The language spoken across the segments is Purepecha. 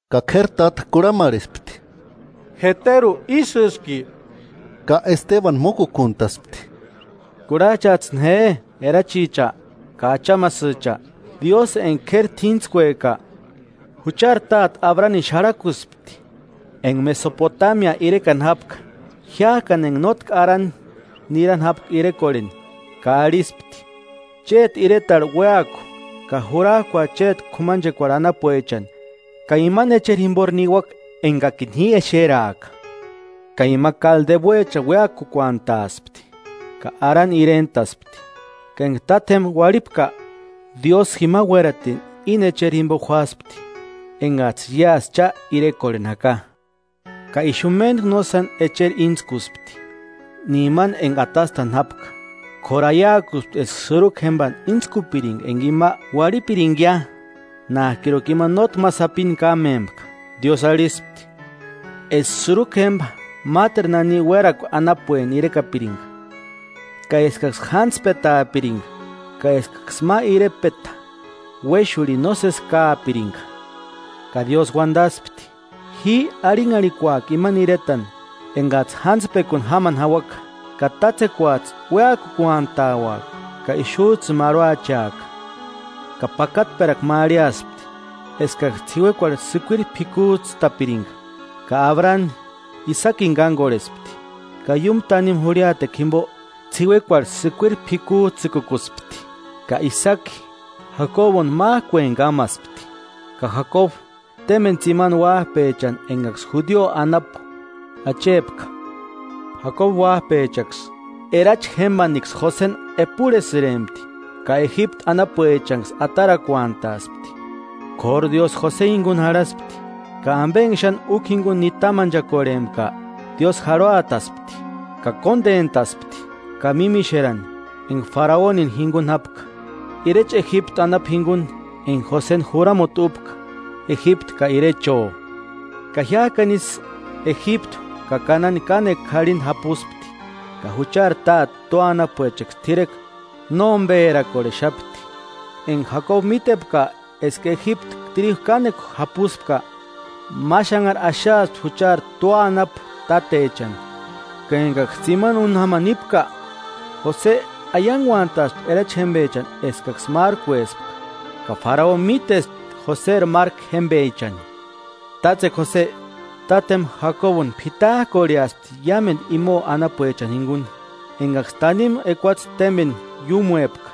Ka k'éri táta kurhamarhespti: –¿Jeteru ísïski? Ka Estebanu mókukuntaspti: “Kurhats'ïni je erachicha ka achamasïcha, Diósï enka k'éri t'íntskueka, juchari táte Abranini xarhakuspti enka Mesopotamia irekani jápka, jiák'ani enka nótki Arani nirani jápka irekorheni, ka arhispti: Chéti iretarhu uéaku ka jurak'ua chéti k'umanchekuarhu anapuechani ka imani echeri jimpori niuaka enkakini ji exeraaka. Ka ima Kaldeuechani uéakukuantaaspti ka Arani irent'aspti, ka enka tátjempa uarhipka, Diósï jima uératini íni echerini jimpo juáspti enkats'ï iásï cha irekorheni jaka. Ka ixu méntku nósani echeri íntskuspti, ni imani enka atastani jápka. K'óru aiakuspti eska sïrukua jémpani íntskupirinka enka ima uarhipirinkia nák'iruka ima nótki ma sapini kámempka. Diósï arhispti eska sïrukua jémpa máteru nani uérakua anapueni irekapirinka, ka eskaksï jántspetaapirinka ka eskaksï ma irepeta uéxurhini nósesi káapirinka. Ka Diósï uantaspti: Ji arhinharhikuaka imani iretani enkats'ï jántspekuni jamani jauaka; ka tátsekuats'ï uéakukuantauaka ka ixuts'ïni marhuacheaka. Ka pakatperakua ma arhiaspti eskaksï ts'iuekuarhu sïkuiri p'ikuts'ïtapirinka, ka Abrani Isakini kánkorhespti ka iúmu tanimu jurhiatekua jimpo ts'iuekuarhu sïkuiri p'ikuts'ïkukuspti. Ka Isaki Jakobuntu mák'ueni kámaspti, ka Jakobu témpeni tsimani uáp'echani enkaksï judio anapu achepka. Jakobu uáp'echaksï, erachi jémpaniksï Joseni epurhesïrempti ka Ejiptu anapuechanksï atarakuantaspti; k'óru Diósï Jose jinkuni jarhaspti, ka ampe enka xáni úkua jinkuni nitamanchakorhempka Diósï jarhuataspti, ka kóntentaspti ka mímixerani enka Faraonini jinkuni jápka, irecha Ejiptu anapu jinkuni enka Joseni juramuti úpka Ejiptu ka irecho.” “Ka jiák'ani ísï Ejiptu ka Kanani kánekua k'arhinkua japuspti, ka juchari táte tua anapuechaksï t'irekua nómperakorhexapti. Enka Jakobu mítepka eska Ejiptu tríju kánekua japuspka, ma xanhari axaaspti juchari tua anapu tátechani. Ka enkaksï tsimani úni jamani nípka, Jose aiankuantaspti erachi jémpechani eskaksï márkuespka, ka Faraoni mítespti Joseri márku jémpechani. Tátsekua Jose, tátjempa Jakobuni p'it'ak'orheaspti iámentu imo anapuechani jinkuni, enkaksï tanimu ekuatse témpeni iúmuepka.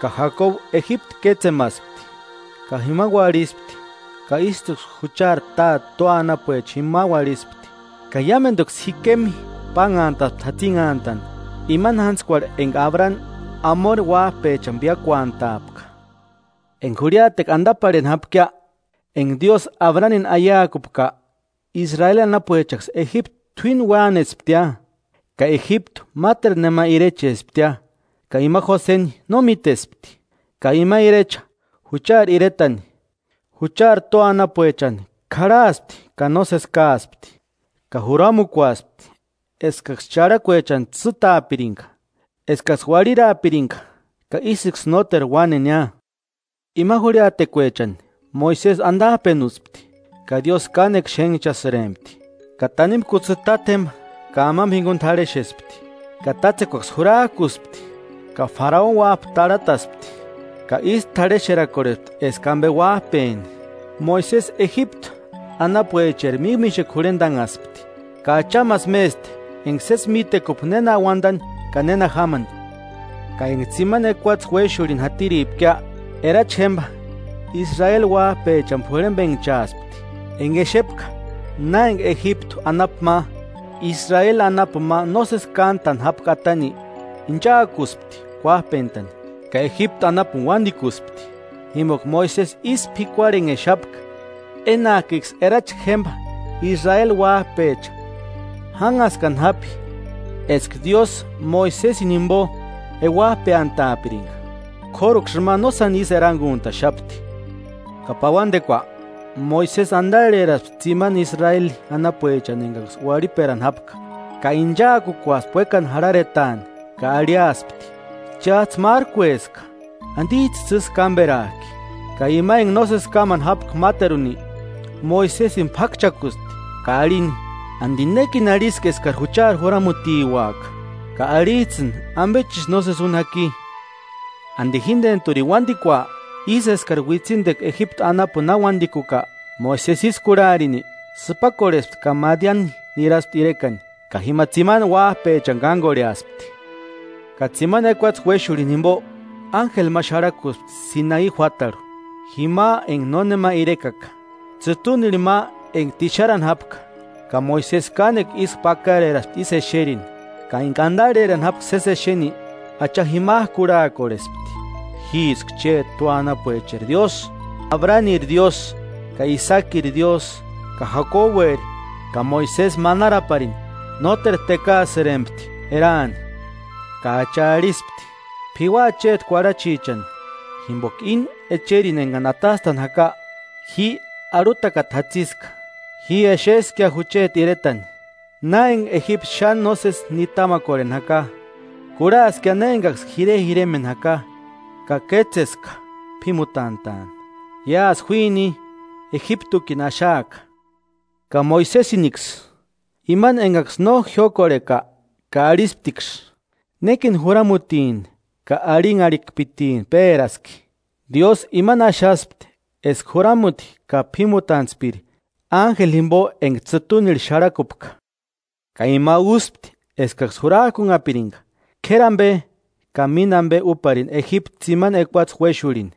Ka Jakobu Ejiptu kétsemaspti ka jima uarhispti ka ístuksï juchari táte tua anapuecha jima uarhispti. Ka iámentuksï Sikemi pánhantaspti jatsinhantani, imani jántskuarhu enka Abrani Amori uáp'echani píakuantaapka.” “Enka jurhiatekua antaparheni jápkia enka Diósï Abranini aiakupka, Israeli anapuechaksï Ejiptu t'uíni uánesptia, ka Ejiptu máteru nema irechesptia ka ima Joseni no mítespti. Ka ima irecha juchari iretani, juchari tua anapuecha k'arhaaspti ka nósesi káaspti ka juramukuaspti eskaksï charhakuechani tsîtaapirinka, eskaksï uarhiraapirinka, ka ísïksï nóteru uánenia. Ima jurhitekuechani Moisesi antap'enuspti, ka Diósï kánekua xénhchasïrempti, ka tanimu kutsï tátjempa ka amampa jinkuni t'arhexespti. Ka tátsekuaksï jurak'uspti, ka Faraoni uáp'a tarhataspti ka ísï t'arhexerakorhespti eska ampe uáp'eni. Moisesi Ejiptu anapuecheri mímixekua jurhentanhaspti, ka achamasï mésti enka sési mítekupka néna uantani ka néna jamani.” Ka enka tsimani ekuatse uéxurhini jatiripkia, erachi jémpa Israeli uáp'echani p'urhempenhchaaspti. Enka exepka na enka Ejiptu anapu ma, Israeli anapuni ma nósesi kántani jápka atani, ichaakuspti kuáp'entani, ka Ejiptu anapuni uántikuspti. Jimpoka Moisesi ísï p'ikuarhenhexapka, enak'iksï erachi jémpa Israeli uáp'echa jánhaskani japi eska Diósï Moisesini jimpo euap'eantaapirinka, k'óruksï ima nósani ísï erankuntaxapti. Ka pauantekua, Moisesi antarheraaspti tsimani Israeli anapuechani enkaksï uarhiperani jápka, ka inchaakukuaspti uékani jarharetaani ka arhiaspti: Cháts'ï márkueska, ¿Antits'ïsï ísï kámperak'i?. Ka ima enka nósesi kámani jápka máteruni, Moisesini p'ákchakuspti ka arhini: ¿Anti nékini arhiski eskari juchari juramutiuaka ka arhits'ïni ampechisï nósesi úni jaki? ¿Anti jíntenturini uántikua, ísï eskari uitsintekua Ejiptu anapuni na uántikuka? Moisesi ísï kurhaarini sïpakorhespti ka Madiani niraspti irekani, ka jima tsimani uáp'echani kánkorheaspti. Ka tsimani ekuatse uéxurhini jimpo, ánjeli ma xarhakuspti Sinai juátarhu, jima enka nónema irekaka, tsïtunirhu ma enka tixarani jápka. Ka Moisesi kánekua ísku pakareraspti ísï exerini, ka enka antarherani jápka sési exeni, Acha jimak'u kurhaakorhespti: Jíska chéti tua anapuecheri Diósï, Abraniri Diósï, ka Isakiri Diósï ka Jakobueri. Ka Moisesi manaraparini nóteru tékaasïrempti eraani. Ka Acha arhispti: “P'iuaa chéti kuarhachichani, jimpoka ini echeri enkari atastatini jaka ji arhutakata jatsiska. Ji exeskia jucheti iretani, na enka Ejiptu xáni nósesi nitamakorheni jaka, kurhaaskia na enkaksï jirejiremeni jaka, ka kétseska p'ímutant'a'ani. Iásï juíni, Ejiptukini axaaka.” “Ka Moisesiniksï, imani enkaksï no jiókorhepka ka arhisptiksï: ‘¿Nékini juramutini ka arhinharhikpitini péraski?’, Diósï imani axaspti eska juramuti ka p'ímutantspiri ánjeli jimpo enka tsïtunirhu xarhakupka. Ka ima úspti eskaksï jurak'unhapirinka, k'éri ampe ka mínta ampe úparini Ejiptu tsimani ekuatse uéxurhini,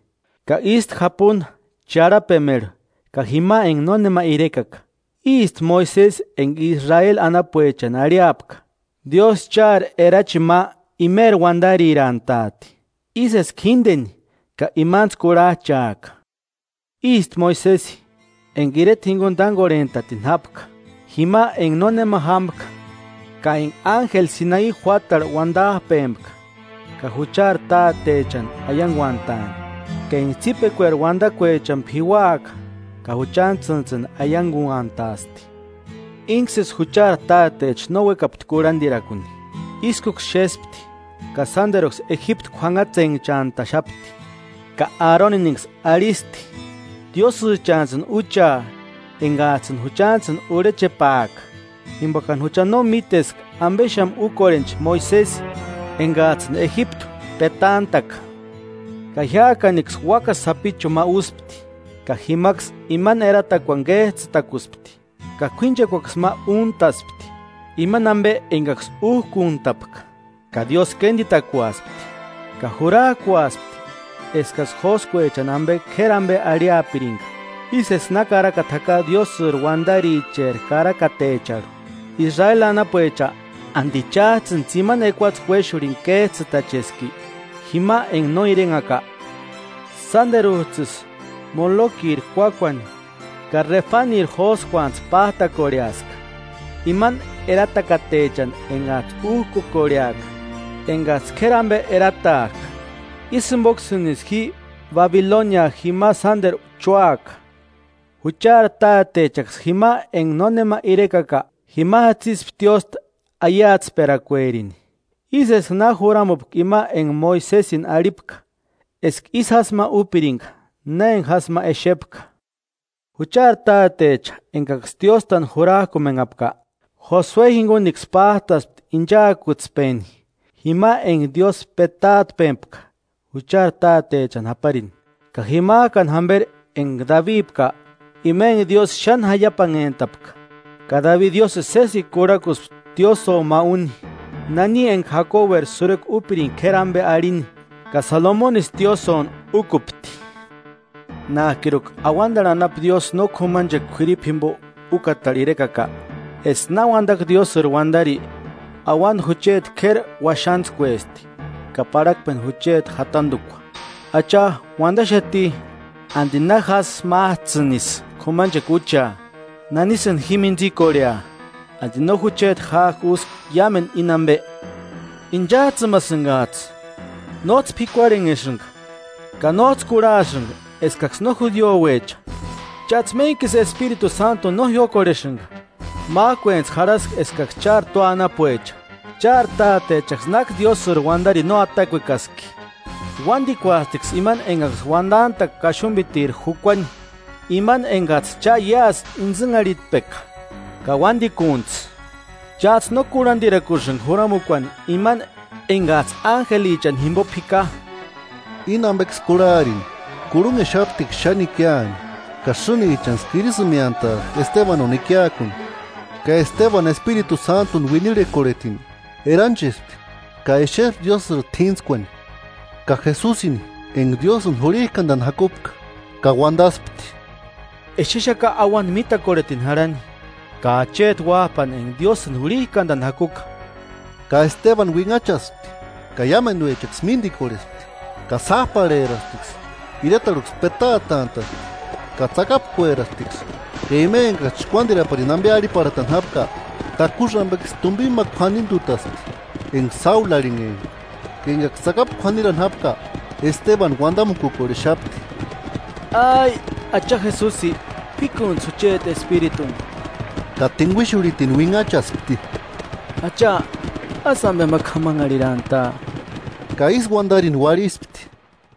ka ístu japunta charhapemerhu ka jima enka nónema irekaka. Ísti Moisesi enka Israeli anapuechani arhiapka: ‘Diósï chári erachini ma imeri uantari úati, ísï eska jínteni ka imantsï kurhach'aaka’. Ísti Moisesi, enka ireta jinkuni tánkorhent'atini jápka jima enka nónema jámka, ka enka ánjeli Sinai juátarhu uantap'empka ka juchari tátechani aiankuantaani, ka enka tsípikueri uantakuechani p'iuaka ka juchantsïntsïni aiankuantaasti. Ínksïsí juchari tátecha no úekapti kurhantirakuni, ískuksï xéspti, ka sánteruksï Ejiptu k'uanhatsenhchant'axapti. Ka Aroniniksï arhisti: Úcheats'ïni diósïchani enkats'ïni juchantsïni urhechepaaka, jimpokani jucha no míteska ampexamu úkorhencha Moisesi enkats'ïni Ejiptu petant'a'ka. Ka jiák'anksï úakasï sapichuni ma úspti, ka jimaksï imani eratakuani kéts'ïtakuspti, ka k'uínchekuaksï ma úkuntaspti imani ampe enkaksï úk'unt'apka. Ka Diósï kéntikukuaspti, ka jurak'uaspti eskaksï jóskuechani ampe k'éri ampe arhiapirinka. Ísï eska na karakata jaka Diósïri uantaricheri karakatecharhu; ‘Israeli anapuecha, ¿Anti cháts'ïni tsimani ekuatse uéxurhini kéts'ïtacheski jima enka no irenhaka? Sánteruts'ïsï Molokiri kuákuani ka Refaniri jóskuantsï pát'akorheaska, imani eratakatechani enkats'ï úk'ukorheaka enkats'ï k'éri ampe eratak'a. Ísï jimpoksïni ji Babilonia jima sánteru chúaka.’ Juchari tátechaksï jima enka nónema irekaka jima jatsispti tiósta aiatsperakuerini, ísï eska na juramupka ima enka Moisesini arhipka eska ísï jásï ma úpirinka na enka jásï ma exepka. Juchari tátecha enkaksï tióstani jurak'umenhapka, Josue jinkunksï pát'aspti inchaakutspeni jima enka Diósï petaatpepka juchari tátechani japarini, ka jimak'ani jamperi enka Dabipka. Ima enka Diósï xáni jaiapanhentapka, ka Dabi Diósïni sésekua kurhakuspti tiósïo ma úni nani enka Jakobueri sïrukua úpirinka k'éri ampe arhini. Ka Salomonisï tiósïoni úkupti. Nák'iruka auantarhu anapu Diósï no k'umachekua k'uiripu jimpo úkatarhu irekaka. Eska na uantaka Diósïri uantari: ‘Auanta jucheti k'éri uaxantskuesti ka parhakpeni jucheti jatantukua. Acha uantaxati, ¿Anti na jásï máts'ïnisï k'umanchekua úchea? ¿Nanisïni ji mintsikorhea? ¿Anti no jucheti ják'i úski iámentu íni ampe?’ ¡Inchats'ïmasïnkats'ï! ¡Nóts'ï p'ikuarhenhesïnka ka nóts'ï kurhasïnka eskaksï no judiuecha! Cháts'ï méntkisï Espiritu Sántuni no jiókorhesïnka. Mák'uentsï jarhaska eskaksï chári tua anapuecha. ¿Chári tátechaksï náki Diósïri uantarini no atakuekaski? Uántikuastiksï imani enkaksï uantant'a'ka Kaxumpitiri jukuani, imani enkats'ï cha iásï intsïnharhitpeka ka uantikuntsï. Cháts'ï no kurhantirakusïnka Juramukuani imani enkats'ï ánjelichani jimpo p'ika.” Íni ampeksï kurhaarini, kurhunhexaptiksï xáni ikiani ka sïnichaksï kirisïmeantaspti Estebanuni ikiakuni. Ka Estebanu Espiritu Sántuni uinirhikorhetini, eranchespti ka exespti Diósïri t'íntskuani, ka Jesusini enka Diósïni jurhinkantani jakupka. Ka uantaspti: –Exexaka auanta mitakorhetini jarhani ka acheti Uáp'ani enka Diósïni jurhik'antani jakuka. Ka Estebanu uinhachaspti ka iámentuechaksï míntikorhespti ka sáp'arherasptiksï. Iretarhuksï petaatant'a'spti ka tsakapkuerasptiksï. Ka ima enkaksï chkuántiraparini ampe arhiparhatani jápka, takusï ampeksï tumpini ma k'uanintutaspti enka Sáulu arhinhempka. Ka enkaksï tsakapu k'uanirani jápka, Estebanu uantamukukorhexapti: “Acha Jesusi, p'íkuntsï jucheti espirituni.” Ka tinkuixurhitini uinhachaspti: “¡Acha, ásï ampe k'amanharhirantaa!” Ka ísï uantarini uarhispti.